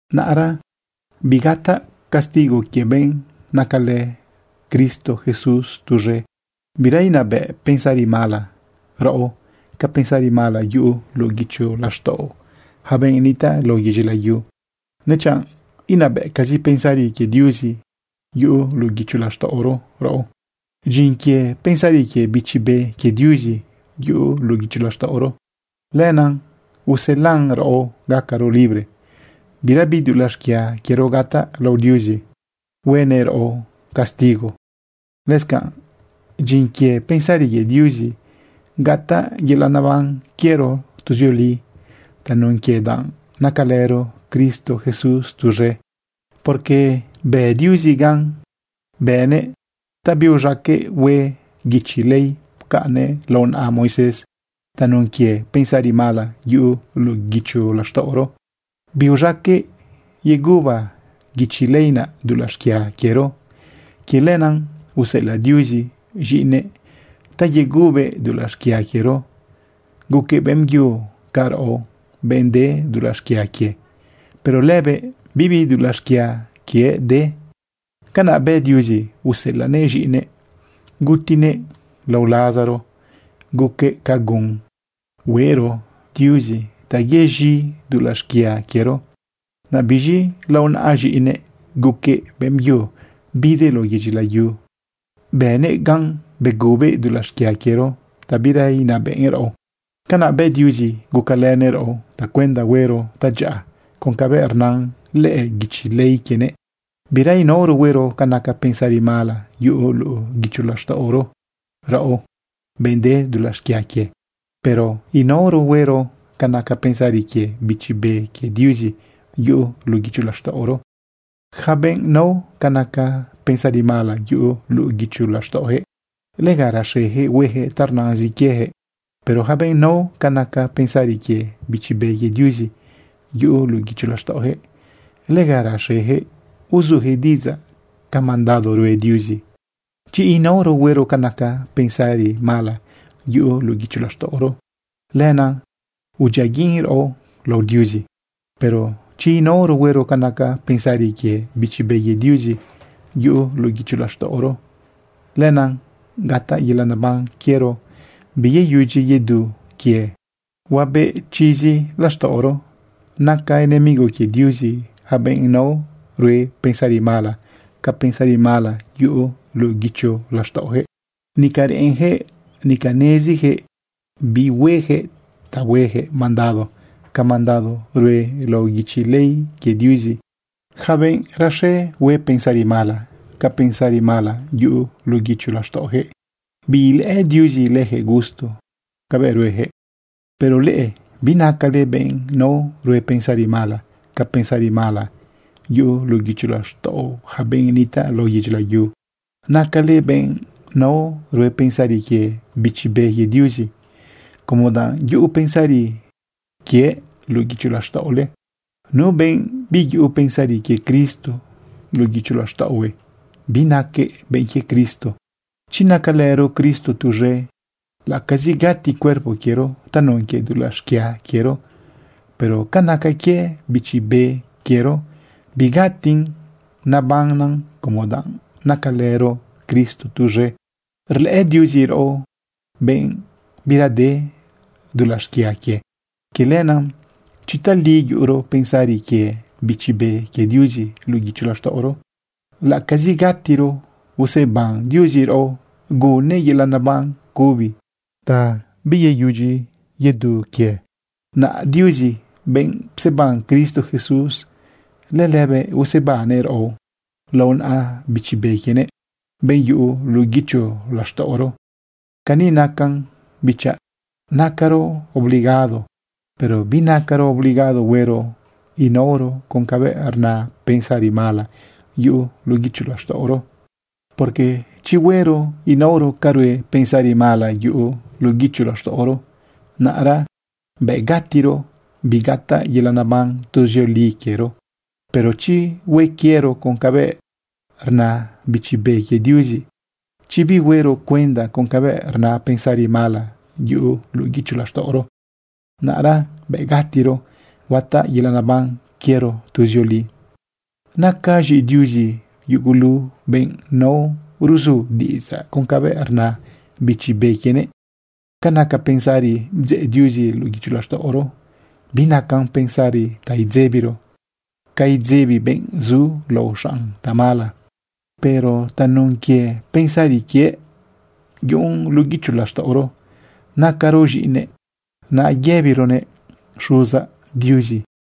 Naꞌra bigataꞌ castigo quie benꞌ nacalë Cristo Jesús tuz̃e. Bira inabëꞌ pensari mala raꞌo ca pensari mala yuꞌu luꞌu guicho laxtaꞌo yaca benꞌ nitaꞌ lao yedyi layu, nechanꞌ inabëꞌcazi pensari quie Diuzi yuꞌu luꞌu guicho laxtaꞌoro raꞌo. Dyin quie pensari quie Bichi Be quie Diuzi yuꞌu luꞌu guicho laxtaꞌoro, lenaꞌ uselan raꞌo gacaro libre. Birabi dulaꞌ xquia quiero gataꞌ lao Diuzi huenëꞌ raꞌo castigo. Lëscanꞌ dyin quie pensari quie Diuzi gataꞌ yelaꞌ neban quiero tuzioli tanun quie danꞌ nacalëro Cristo Jesús tuz̃e. Porque bë Diuzi gan bënëꞌ ta biuz̃aqueꞌ hue guichi ley pcaꞌnnëꞌ lao naꞌa Moisés. Tanun quie pensari mala yuꞌu luꞌu guicho laxtaꞌoro, biuz̃aqueꞌ yeguba guichi ley naꞌ dulaꞌ xquia quiero. Quie lenaꞌ, useꞌelaꞌ Diuzi z̃iꞌinëꞌ ta yegubëꞌ dulaꞌ xquia quiero. Guquëꞌ beꞌmbyu ca raꞌo, benꞌ de dulaꞌ xquia quie, pero lëbëꞌ bibi dulaꞌ xquia quiëꞌ de. Canaꞌ bë Diuzi useꞌelaꞌnëꞌ z̃iꞌinëꞌ gutinëꞌ lao lazaro guquëꞌ ca gun hueꞌro Diuzi ta yez̃i dulaꞌ xquia quiero. Naꞌ biz̃i lao naꞌa z̃iꞌinëꞌ guquëꞌ beꞌmbyu bidëꞌ lao yedyi layu, bënëꞌ gan begubëꞌ dulaꞌ xquia quiero ta bira inabëꞌn raꞌo. Canaꞌ bë Diuzi gucalënëꞌ raꞌo tacuenda huero tadyaꞌa con cabëꞌ rnan lëꞌë guichi ley quienëꞌ. Bira inaoro huero ca naca pensari mala yuꞌu luꞌu guicho laxtaꞌoro raꞌo, benꞌ de dulaꞌ xquia quie. Pero inaoro huero ca naca pensari quie Bichi Be quie Diuzi yuꞌu luꞌu guicho laxtaꞌoro. Yaca benꞌ nao ca naca pensari mala yuꞌu luꞌu guicho laxtaꞌojëꞌ, lega raxeyaquëꞌ huejëꞌ ta rnazin quiejëꞌ. Pero yaca benꞌ nao ca naca pensari quie Bichi Be quie Diuzi yuꞌu luꞌu guicho laxtaꞌojëꞌ, lega raxejëꞌ uzujëꞌ diꞌidzaꞌ ca mandado rue Diuzi. Chi inaoro huero ca naca pensari mala yuꞌu luꞌu guicho laxtaꞌoro, lenaꞌ udyiaguiꞌn raꞌo lao Diuzi. Pero chi inaoro huero ca naca pensari quie Bichi Be quie Diuzi yuꞌu luꞌu guicho laxtaꞌoro, lenaꞌ gataꞌ yelaꞌ neban quiero biyeyudyi yedu quie, huabeꞌ chizi laxtaꞌoro. Naca enemigo quie Diuzi yaca benꞌ nao rue pensari mala ca pensari mala yuꞌu luꞌu guicho laxtaꞌojëꞌ. Nica reꞌenjëꞌ, nica nezijëꞌ bi huejëꞌ ta huejëꞌ mandado ca mandado rue lao guichi ley quie Diuzi. Yaca benꞌ raxe hue pensari mala ca pensari mala yuꞌu luꞌu guicho laxtaꞌojëꞌ, biilëꞌë Diuzi lëjëꞌ gusto cabëꞌ rueyaquëꞌ. Pero leꞌe binacale benꞌ nao rue pensari mala ca pensari mala yuꞌu luꞌu guicho laxtaꞌo yaca benꞌ nitaꞌ lao yedyi layu. Nacale benꞌ nao rue pensari quie Bichi Be quie Diuzi, como danꞌ yuꞌu pensari quiëꞌ luꞌu guicho laxtaꞌole. Nu benꞌ biyuꞌu pensari quie Cristo luꞌu guicho laxtaꞌohue, binaquëꞌ benꞌ quie Cristo. Chi nacalëro Cristo tuz̃e, laꞌacazi gati cuerpo quiero tanun quie dulaꞌ xquia quiero, pero ca naca quie bichi be quiero, bigatin nabannan como danꞌ nacalëro Cristo tuz̃e rlëꞌë Diuzi raꞌo benꞌ bira de dulaꞌ xquia quie. Quie lenaꞌ chi tali yuꞌuro pensari quie Bichi Be quie Diuzi luꞌu guicho laxtaꞌoro, laꞌacazi gatiro, useban Diuzi raꞌo gunnëꞌ yelaꞌ neban cubi ta biyeyudyi yedu quie. Naꞌ Diuzi, benꞌ pseban Cristo Jesús, lëlëbëꞌ usebannëꞌ raꞌo lao naꞌa Bichi Be quienëꞌ, benꞌ yuꞌu luꞌu guicho laxtaꞌoro. Cani nacan bichaꞌ, nacaro obligado, pero binacaro obligado huero inaoro con cabëꞌ rna pensari mala yuꞌu luꞌu guicho laxtaꞌoro. Porque chi huero inaoro ca rue pensari mala yuꞌu luꞌu guicho laxtaꞌoro, naꞌra bëꞌ gatiro, bigataꞌ yelaꞌ neban tuzioli quiero. Pero chi hue quiero con cabëꞌ rna Bichi Be quie Diuzi, chi bihuero cuenda con cabëꞌ rna pensari mala yuꞌu luꞌu guicho laxtaꞌoro, naꞌra bëꞌ gatiro, huataꞌ yelaꞌ neban quiero tuzioli. Naca z̃iꞌi Diuzi yugulu benꞌ nao ruzu diꞌidzaꞌ con cabëꞌ rna Bichi Be quienëꞌ. Ca naca pensari bdzeꞌ Diuzi luꞌu guicho laxtaꞌoro, binacan pensari ta idzebiro ca idzebi benꞌ zu lao xaꞌn tamala. Pero tanun quie pensari quiëꞌ yuꞌun luꞌu guicho laxtaꞌoro, nacaro z̃iꞌinëꞌ, naꞌ yëbironëꞌ: “Xuzaꞌ Diuzi.”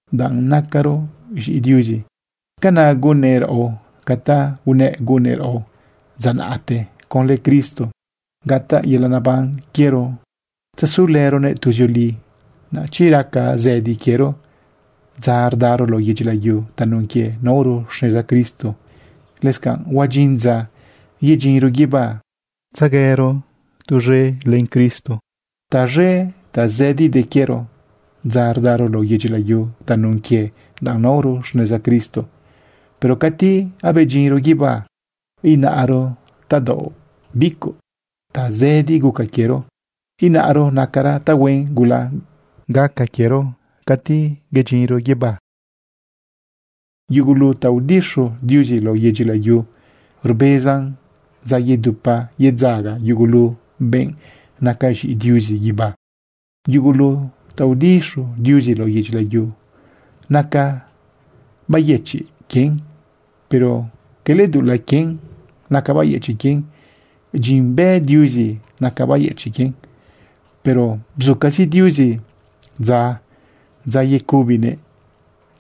Danꞌ nacaro z̃iꞌi Diuzi, canaꞌ gunnëꞌ raꞌo ca ta unëꞌ gunnëꞌ raꞌo dza naꞌte. Conlë Cristo gataꞌ yelaꞌ neban quiero tzesulëronëꞌ tuzioli. Naꞌ chi raca zëdi quiero dza rdaro lao yedyi layu tanun quie naoro xneza Cristo, lëscanꞌ huadyin dza yedyinro guibá tzahuero tuz̃e len Cristo. Taz̃e tazëdi de quiero dza rdaro lao yedyi layu tanun quie danꞌ naoro xneza Cristo, pero cati abedyinro guibá inaro tadaoꞌ bicuꞌ tazëdi guca quiero. Inaro nacara tahuen gula gaca quiero cati bedyinro guibá. Yugulu ta udixu Diuzi lao yedyi layu rbezan dza yedupa yedzaga yugulu benꞌ naca z̃iꞌi Diuzi guibá. Yugulu ta udixu Diuzi lao yedyi layu naca bayëchiꞌ quien, pero cala dulaꞌ quien naca bayëchiꞌ quien. Dyin bë Diuzi naca bayëchiꞌ quien, pero bzucazi Diuzi dza, dza yecubinëꞌ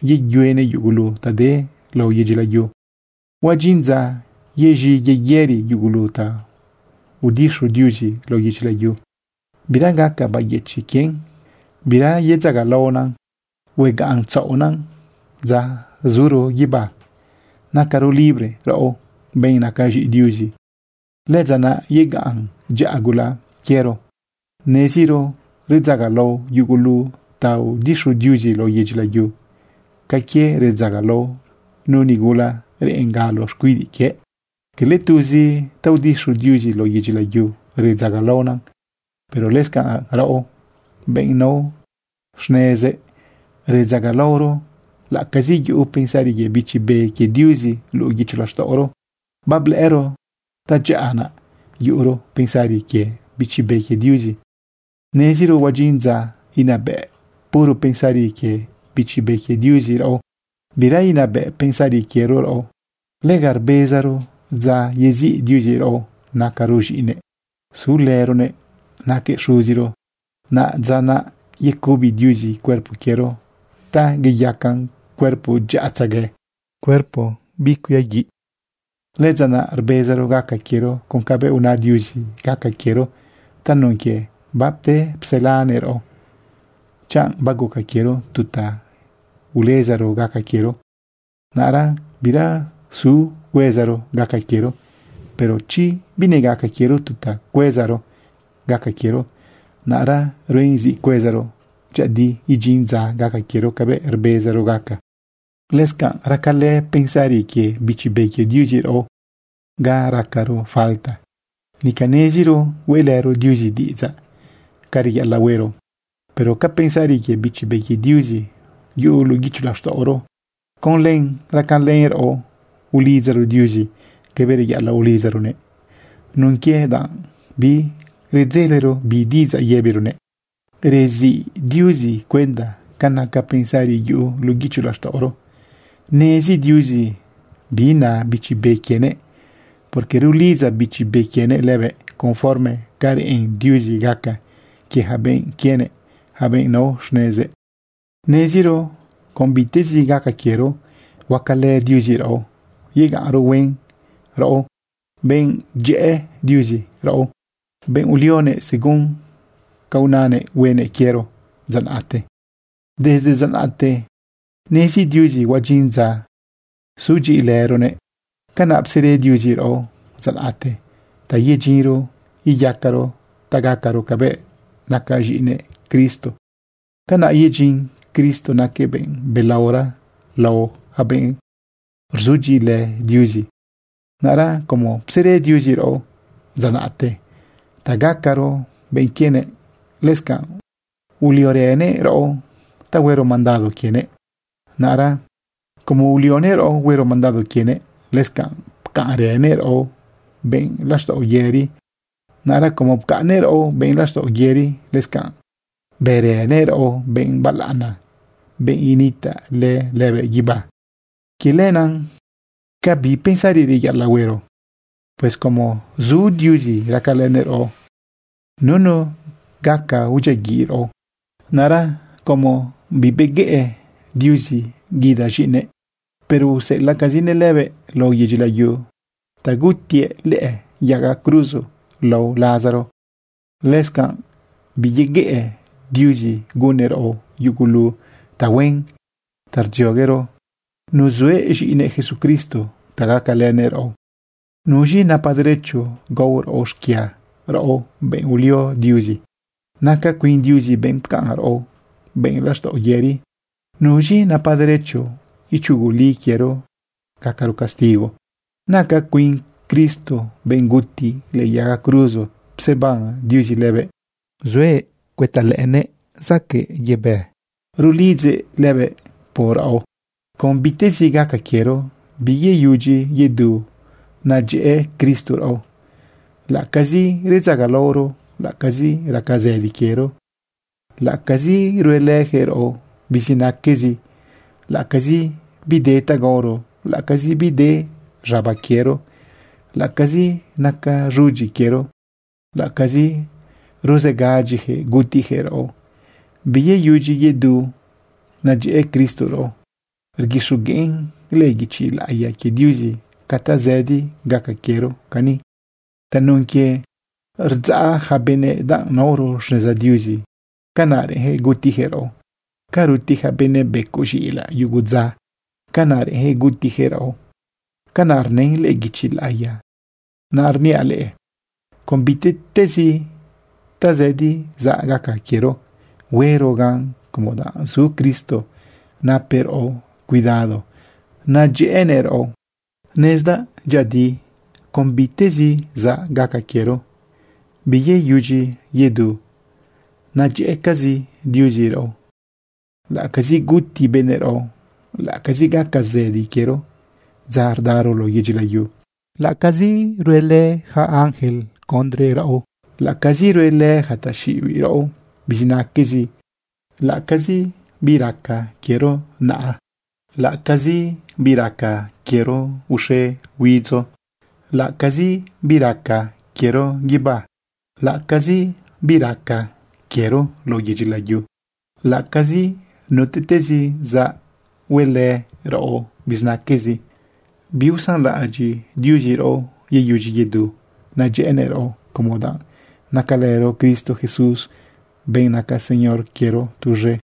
yeyuenëꞌ yugulu ta de lao yedyi layu. Huadyin dza yez̃i yeyëri yugulu ta udixu Diuzi lao yedyi layu. Bira gaca bayëchiꞌ quien, bira yedzagalaona. Huegaꞌn tzaoꞌna dza zuro guibá nacaro libre raꞌo, benꞌ naca z̃iꞌi Diuzi. Lëdza naꞌ yegaꞌn dyaꞌa gula quiero. Neziro redzagalao yugulu ta udixu Diuzi lao yedyi layu ca quie redzagalao nu nigula reꞌen galo xcuidiꞌ quie. Cala tuzi ta udixu Diuzi lao yedyi layu redzagalaona, pero lëscanꞌ raꞌo, benꞌ nao xnezëꞌ, redzagalaoro laꞌacazi yuꞌu pensari quie Bichi Be quie Diuzi luꞌu guicho laxtaꞌoro. Bablëꞌëro tadyaꞌa naꞌ yuꞌuro pensari quie Bichi Be quie Diuzi. Neziro huadyin dza inabëꞌ puro pensari quie Bichi Be quie Diuzi raꞌo, bira inabëꞌ pensari quiero raꞌo. Lega rbezaro dza yeziꞌ Diuzi raꞌo nacaro z̃iꞌinëꞌ sulëronëꞌ naquëꞌ Xuziro. Naꞌ dza naꞌ yecubi Diuzi cuerpo quiero ta iyacan cuerpo dyaꞌatzegue, cuerpo bicuiaguiꞌn. Lëdza naꞌ rbezaro gaca quiero con cabëꞌ una Diuzi gaca quiero tanun quie bapte pselanëꞌ raꞌo. Chanꞌ baguca quiero tu ta ulezaro gaca quiero, naꞌra bira zu cuezaro gaca quiero. Pero chi binegaca quiero tu ta cuezaro gaca quiero, naꞌra ruen zi cuezaro dyëꞌëdi idyin dza gaca quiero cabëꞌ rbezaro gaca. Lëscanꞌ racalë pensari quie Bichi Be quie Diuzi raꞌo ga racaro falta. Nica neziro hueꞌlëro Diuzi diꞌidzaꞌ ca reyaꞌalaꞌ huero. Pero ca pensari quie Bichi Be quie Diuzi yuꞌu luꞌu guicho laxtaꞌoro, con len racalën raꞌo ulidzaro Diuzi cabëꞌ reyaꞌalaꞌ ulidzaronëꞌ nun quie danꞌ biredzelero bi diꞌidzaꞌ yëbironëꞌ. Reziꞌ Diuzi cuenda ca naca pensari yuꞌu luꞌu guicho laxtaꞌoro. Nezi Diuzi bi na Bichi Be quienëꞌ, porque rulidza Bichi Be quienëꞌ lëbëꞌ conforme ca reꞌen Diuzi gaca quie yaca benꞌ quienëꞌ, yaca benꞌ nao xnezëꞌ. Neziro con bitezi gaca quiero, huacalë Diuzi raꞌo yegaꞌnro huen, raꞌo, benꞌ dyëꞌë Diuzi, raꞌo, benꞌ ulionëꞌ según ca unanëꞌ huenëꞌ quiero dza naꞌte. Desde dza naꞌte nezi Diuzi huadyin dza sudyiꞌilëronëꞌ. Canaꞌ psere Diuzi raꞌo dza naꞌte ta yedyinro iyacaro ta gacaro cabëꞌ naca z̃iꞌinëꞌ Cristo. Canaꞌ yedyin Cristo naquëꞌ benꞌ belaora lao yaca benꞌrzudyiꞌilë Diuzi. Naꞌra como psere Diuzi raꞌo dza naꞌte ta gacaro benꞌ quienëꞌ, lëscanꞌ uliorënëꞌ raꞌo ta huero mandado quienëꞌ. Naꞌra como ulionëꞌ raꞌo huero mandado quienëꞌ, lëscanꞌ pcaꞌnrënëꞌ raꞌo benꞌ laxtaꞌo yëri. Naꞌra como pcaꞌnnëꞌ raꞌo benꞌ laxtaꞌo yëri, lëscanꞌ bërënëꞌ raꞌo benꞌ balaꞌana, benꞌ initaꞌlë lëbëꞌ guibá. Quie lenaꞌ, ¿ca bi pensari reyaꞌalaꞌ huero? Pues como zu Diuzi racalënëꞌ raꞌo, nunu gaca udyiaguiꞌ raꞌo. Naꞌra como bibeguëꞌ Diuzi guida z̃iꞌinëꞌ, pero useꞌelaꞌcazineꞌ lëbëꞌ lao yedyi layu ta gutiëꞌ lëꞌë yaga cruzo lao lazaro, lëscanꞌ biyeguëꞌ Diuzi gunnëꞌ raꞌo yugulu tahuen ta rdzioguero nuzuëꞌ z̃iꞌinëꞌ Jesucristo ta gacalënëꞌ raꞌo. ¿Nuz̃i napa derecho gao raꞌo xquia, raꞌo, benꞌ ulio Diuzi? Naca cuin Diuzi benꞌ pcaꞌn raꞌo benꞌ laxtaꞌo yëri. ¿Nuz̃i napa derecho ichuguli quiero gacaro castigo? Naca cuin Cristo benꞌ guti lëꞌë yaga cruzo pseban Diuzi lëbëꞌ, zuëꞌ cuëta lëꞌënëꞌ zaquëꞌ yebë, rulidzëꞌ lëbëꞌ por raꞌo. Con bitezi gaca quiero biyeyudyi yedu nadyëꞌë Cristo raꞌo. Laꞌacazi redzagalaoro, laꞌacazi raca zëdi quiero, laꞌacazi ruelëjëꞌ raꞌo bizinaquezi, laꞌacazi bide ta gaoro, laꞌacazi bide z̃aba quiero, laꞌacazi naca z̃udyi quiero, laꞌacazi ruzegadyijëꞌ gutijëꞌ raꞌo, biyeyudyi yedu nadyëꞌë Cristo raꞌo. Rguixogueꞌn lëꞌë guichi laꞌiya quie Diuzi ca tazëdi gaca quiero cani: Tanun quie rdzaꞌ yaca benëꞌ danꞌ naoro xneza Diuzi, canaꞌ reꞌenjëꞌ gutijëꞌ raꞌo. Ca ruti ja benëꞌ becoꞌ z̃iꞌilaꞌ yugu dza, canaꞌ reꞌenjëꞌ gutijëꞌ raꞌo. Canaꞌ rnën lëꞌë guichi laꞌiya. Naꞌrniaꞌ leꞌe, con bitezi tazëdi zaꞌ gaca quiero, huero gan como danꞌ zu Cristo napëꞌ raꞌo cuidado nadyëꞌënëꞌ raꞌo. Nezdaꞌ dyëꞌëdi con bitezi zaꞌ gaca quiero, biyeyudyi yedu nadyëꞌë Diuzi raꞌo. Laꞌacazi guti benëꞌ raꞌo, laꞌacazi gaca zëdi quiero dza rdaro lao yedyi layu, laꞌacazi rue yaca ángel condre raꞌo, laꞌacazi ruelë yaca taxiꞌibiꞌ raꞌo bizinaquezi, laꞌacazi bi raca quiero naꞌa, laꞌacazi bi raca quiero uxe huidzo, laꞌacazi bi raca quiero guibá, laꞌacazi bi raca quiero lao yedyi layu, laꞌacazi nutiꞌtezi zaꞌ huelë raꞌo bizinaquezi, biusanlaꞌadyiꞌ Diuzi raꞌo, biyeyudyi yedu nadyëꞌënëꞌ raꞌo como danꞌ nacalëro Cristo Jesús, benꞌ naca Señor quiero, tuz̃e.